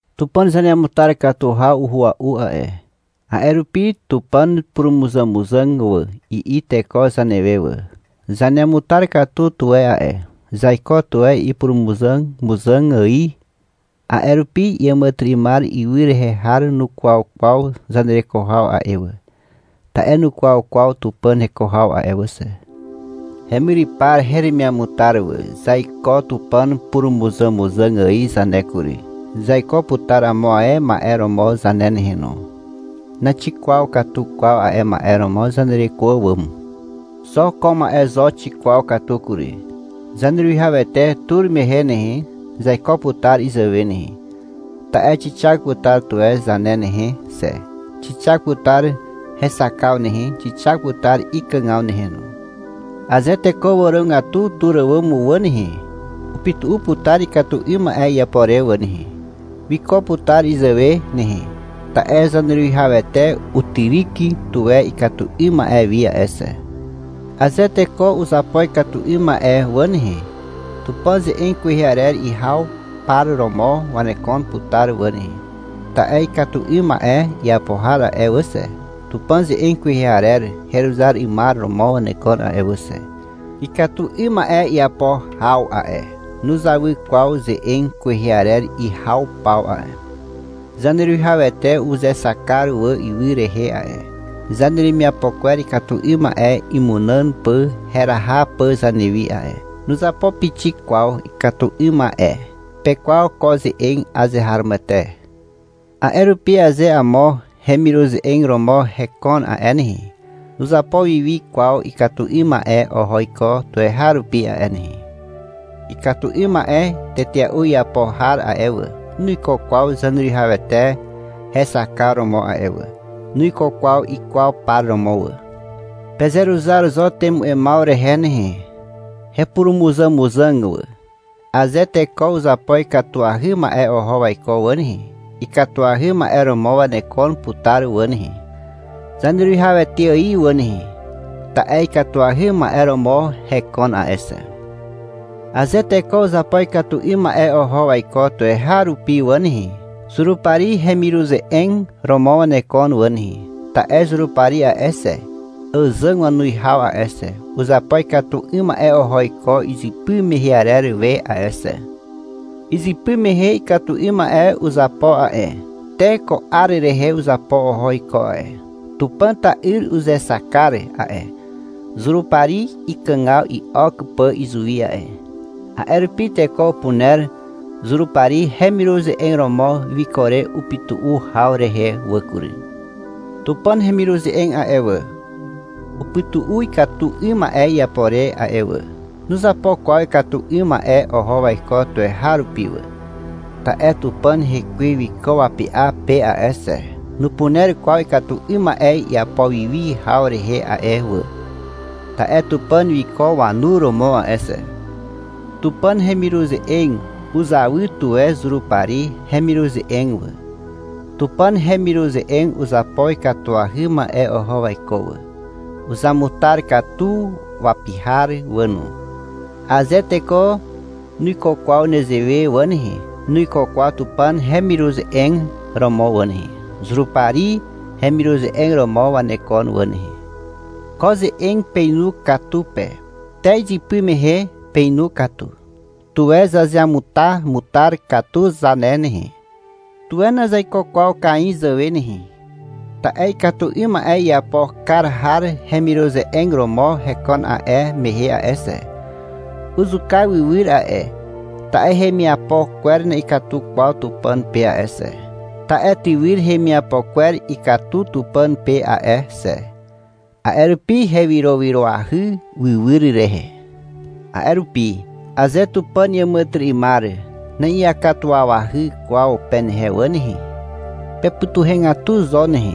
Tupàn zaneamutar katu haw uhua'u a'e, a'e rupi — Tupàn purumuzàmuzàg wà, i'i teko zanewe wà. Zaneamutar katu tuwe a'e. Zaiko tuwe ipurumuzàmuzàg ài. A'e rupi iàmàtyry'ymar ywy rehe har nukwaw kwaw zanereko haw a'e wà, ta'e nukwaw kwaw Tupàn heko haw a'e wà xe. Hemyrypar heremiamutar wà. Zaiko Tupàn purumuzàmuzàg ài zane kury. Zaiko putar amo ae ma'e romo zane nehe no. Naxikwaw katu kwaw a'e ma'e romo zanereko àwàm. Xo ko ma'e zo xikwaw katu kury. Zaneruwihawete tur mehe nehe, zaiko putar izàwe nehe, ta'e xixak putar tuwe zane nehe xe. Xixak putar hexakaw nehe. Xixak putar ikàgaw nehe no. Aze teko wàrogatu tur àwàm wà nehe, upytu'u putar ikatu 'ym ma'e iapo re wà nehe. Wiko putar izàwe nehe, ta'e Zaneruwihawete utyryk tuwe ikatu 'ym ma'e wi a'e xe. Aze teko uzapo ikatu 'ym ma'e wà nehe, Tupàn ze'eg kwehe arer ihaw par romo wanekon putar wà nehe, ta'e ikatu 'ym ma'e iapo har a'e wà xe, Tupàn ze'eg kwehe arer heruzar 'ymar romo wanekon a'e wà xe. Ikatu 'ym ma'e iapo haw a'e, nuzawy kwaw ze'eg kwehe arer ihaw paw a'e. Zaneruwihawete uzexak kar wà ywy rehe a'e, zaneremiapo kwer ikatu 'ym ma'e imunàn pà heraha pà zanewi a'e. Nuzapo pixik kwaw ikatu 'ym ma'e. Pekwaw ko ze'eg. Azeharomoete. A'e rupi aze amo hemiruze'eg romo hekon a'e nehe, nuzapo wiwi kwaw ikatu 'ym ma'e oho iko tuweharupi a'e nehe. Ikatu 'ym ma'e tetea'u iapo har a'e wà, nuiko kwaw Zaneruwihawete hexakar romo a'e wà. Nuiko kwaw ikwaw par romo wà. Pezeruzar zo temu'emaw rehe nehe, hepurumuzàmuzàg wà. Aze teko uzapo ikatuahy ma'e oho waiko wà nehe, ikatuahy ma'e romo wanekon putar wà nehe. Zaneruwihawete ài wà nehe, ta'e ikatuahy ma'e romo hekon a'e xe. Aze teko uzapo ikatu 'ym ma'e oho waiko tuweharupi wà nehe, Zurupari hemiruze'eg romo wanekon wà nehe, ta'e Zurupari a'e xe, (àzàg wanuwihaw a'e xe), uzapo ikatu 'ym ma'e oho iko izypy mehe arer we a'e xe. Izypy mehe ikatu 'ym ma'e uzapo a'e, te ko 'ar rehe uzapo oho iko a'e. Tupàn ta'yr uzexak kar a'e, Zurupari ikàgaw i'ok pà izuwi a'e. (A'e rupi teko upuner Zurupari hemiruze'eg romo wiko re upytu'u haw rehe wà kury.) Tupàn hemiruze'eg a'e wà, upytu'u ikatu 'ym ma'e iapo re a'e wà. Nuzapo kwaw ikatu 'ym ma'e oho waiko tuweharupi wà. Ta'e Tupàn Hekwe wiko wapy'a pe a'e xe. Nupuner kwaw ikatu 'ym ma'e iapo wiwi haw rehe a'e wà, ta'e Tupàn wiko wanu romo a'e xe. Tupàn hemiruze'eg uzawy tuwe Zurupari hemiruze'eg wà. Tupàn hemiruze'eg uzapo ikatuahy ma'e oho waiko wà. Uzamutar katu wapi har wà no. Aze teko nuiko kwaw nezewe wà nehe, nuiko kwaw Tupàn hemiruze'eg romo wà nehe. Zurupari hemiruze'eg romo wanekon wà nehe. Ko ze'eg peinu katu pe. Te izypy mehe peinu katu. Tuwe zazeamutamutar katu zane nehe. Tuwe nazaiko kwaw Kain zàwe nehe. Ta'e ikatu 'ym ma'e iapo kar har hemiruze'eg romo hekon a'e mehe a'e xe. Uzuka wywyr a'e, ta'e hemiapo kwer na'ikatu kwaw Tupàn pe a'e xe. Ta'e tywyr hemiapo kwer ikatu Tupàn pe a'e xe. A'e rupi hewyrowyroahy wywyr rehe. A'e rupi, — Aze Tupàn iàmàtyry'ymar na'iakatuwawahy kwaw penehe wà nehe, pepytuhegatu zo nehe,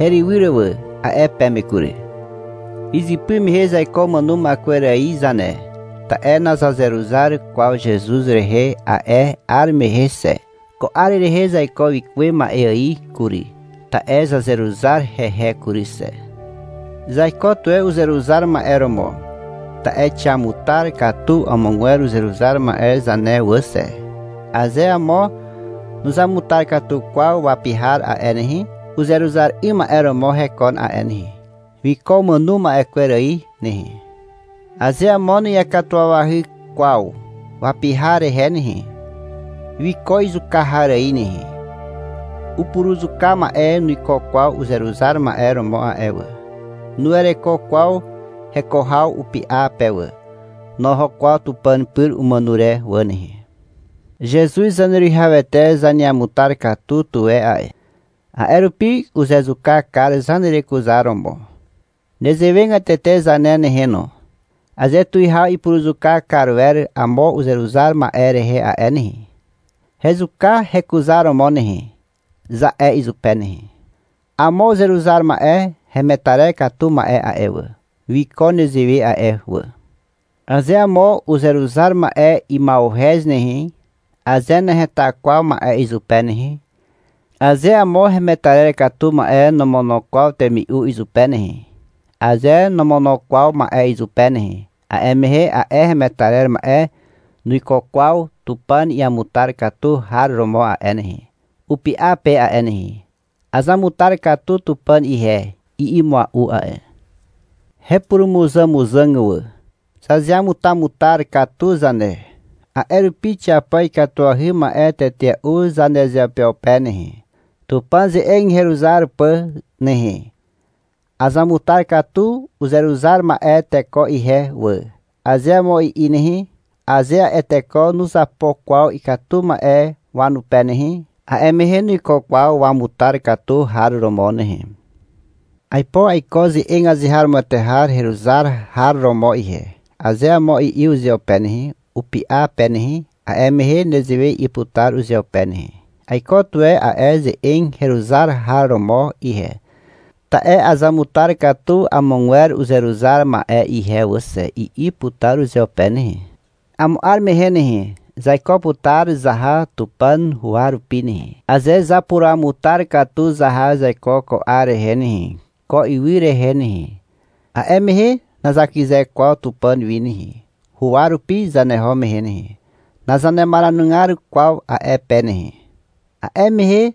herywyr wà, a'e peme kury. Izypy mehe zaiko umàno ma'e kwer ài zane. Ta'e nazazeruzar kwaw Zezuz rehe a'e 'ar mehe xe. Ko 'ar rehe zaiko wikuwe ma'e ài kury, ta'e zazeruzar hehe kury xe. Zaiko tuwe uzeruzar ma'e romo, ta'e xiamutar katu amogwer uzeruzar ma'e zane wà xe. Aze amo nuzamutar katu kwaw wapi har a'e nehe, uzeruzar 'ym ma'e romo hekon a'e nehe. Wiko umàno ma'e kwer ài nehe. Aze amo na'iakatuwawahy kwaw wapi har rehe nehe, wiko izuka har ài nehe. Upuruzuka ma'e nuiko kwaw uzeruzar ma'e romo a'e wà. Nuwereko kwaw heko haw upy'a pe wà. Noho kwaw Tupàn pyr umàno re wà nehe. Zezuz Zaneruwihawete zaneamutar katu tuwe a'e. A'e rupi uzezuka kar zanerekuzaromo. Nezewegatete zane nehe no. Aze tuwihaw ipuruzuka kar wer amo uzeruzar ma'e rehe a'e nehe, — Hezuka hekuzaromo nehe, za'e izupe nehe. Amo uzeruzar ma'e hemetarer katu ma'e a'e wà, wiko nezewe a'e wà. Aze amo uzeruzar ma'e ima'uhez nehe, aze naheta kwaw ma'e izupe nehe, aze amo hemetarer katu ma'e nomono kwaw temi'u izupe nehe, aze nomono kwaw ma'e izupe nehe, a'e mehe a'e hemetarer ma'e nuiko kwaw Tupàn iamutar katu har romo a'e nehe, upy'a pe a'e nehe. — Azamutar katu Tupàn ihe, i'i mua'u a'e. Hepurumuzàmuzàg wà. Zazeamutamutar katu zane. A'e rupi xiapo ikatuahy ma'e tetea'u zanezeupeupe nehe, Tupàn ze'eg heruzar pà nehe. — Azamutar katu uzeruzar ma'e teko ihe wà, aze amo i'i nehe, aze a'e teko nuzapo kwaw ikatu ma'e wanupe nehe, a'e mehe nuiko kwaw wamutar katu har romo nehe. — Aipo aiko ze'eg azeharomoete har heruzar har romo ihe, aze amo i'i uzeupe nehe, upy'a pe nehe, a'e mehe nezewe i'i putar uzeupe nehe. — Aiko tuwe a'e ze'eg heruzar har romo ihe, ta'e azamutar katu amogwer uzeruzar ma'e ihe wà xe, i'i putar uzeupe nehe. Amo 'ar mehe nehe, zaiko putar zaha Tupàn huwa rupi nehe. Aze zapuruamutar katu zaha zaiko ko 'ar rehe nehe, ko ywy rehe nehe, a'e mehe nazakyze kwaw Tupàn wi nehe, huwa rupi zaneho mehe nehe. Nazanemaranugar kwaw a'e pe nehe. A'e mehe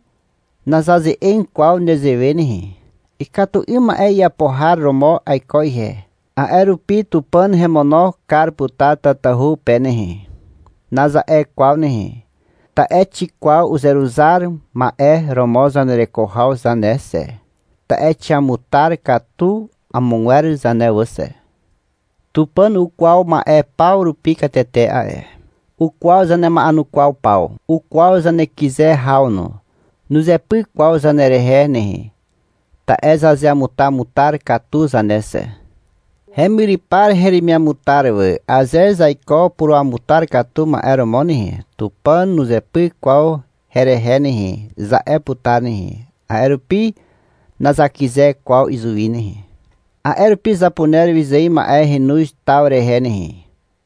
nazaze'eg kwaw nezewe nehe. — Ikatu 'ym ma'e iapo har romo aiko ihe, a'e rupi Tupàn hemono kar putar tatahu pe nehe, naza'e kwaw nehe, ta'e xikwaw uzeruzar ma'e romo zanereko haw zane xe, ta'e xiamutar katu amogwer zane wà xe. Tupàn ukwaw ma'e paw rupi katete a'e. Ukwaw zanema'enukwaw paw. Ukwaw zanekyze haw no. Nuzepyk kwaw zanerehe nehe, ta'e zazeamutamutar katu zane xe. Hemyrypar heremiamutar wà. Aze zaiko puruamutar katu ma'e romo nehe, — Tupàn nuzepyk kwaw herehe nehe, za'e putar nehe. A'e rupi nazakyze kwaw izuwi nehe. A'e rupi zapuner wyzài ma'e henoz taw rehe nehe.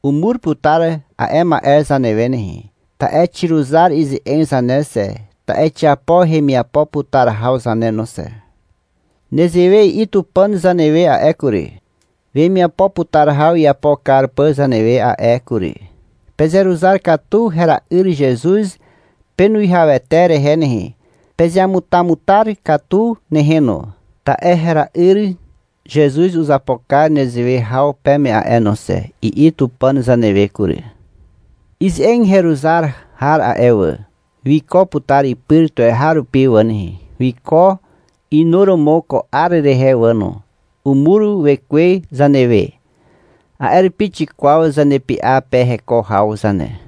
Umur putar a'e ma'e zanewe nehe, ta'e xiruzar ize'eg zane xe, ta'e xiapo hemiapo putar haw zane no xe. Nezewe i'i Tupàn zanewe a'e kury, wemiapo putar haw iapo kar pà zanewe a'e kury. — Pezeruzar katu hera'yr Zezuz penuwihawete rehe nehe. Pezeamutamutar katu nehe no, ta'e hera'yr Zezuz uzapo kar nezewe haw peme a'e no xe, i'i Tupàn zanewe kury. Ize'eg heruzar har a'e wà, wiko putar ipyr tuweharupi wà nehe. Wiko inuromo ko 'ar rehe wà no. Umur Wekwe zanewe. A'e rupi xikwaw zanepy'a pe heko haw zane.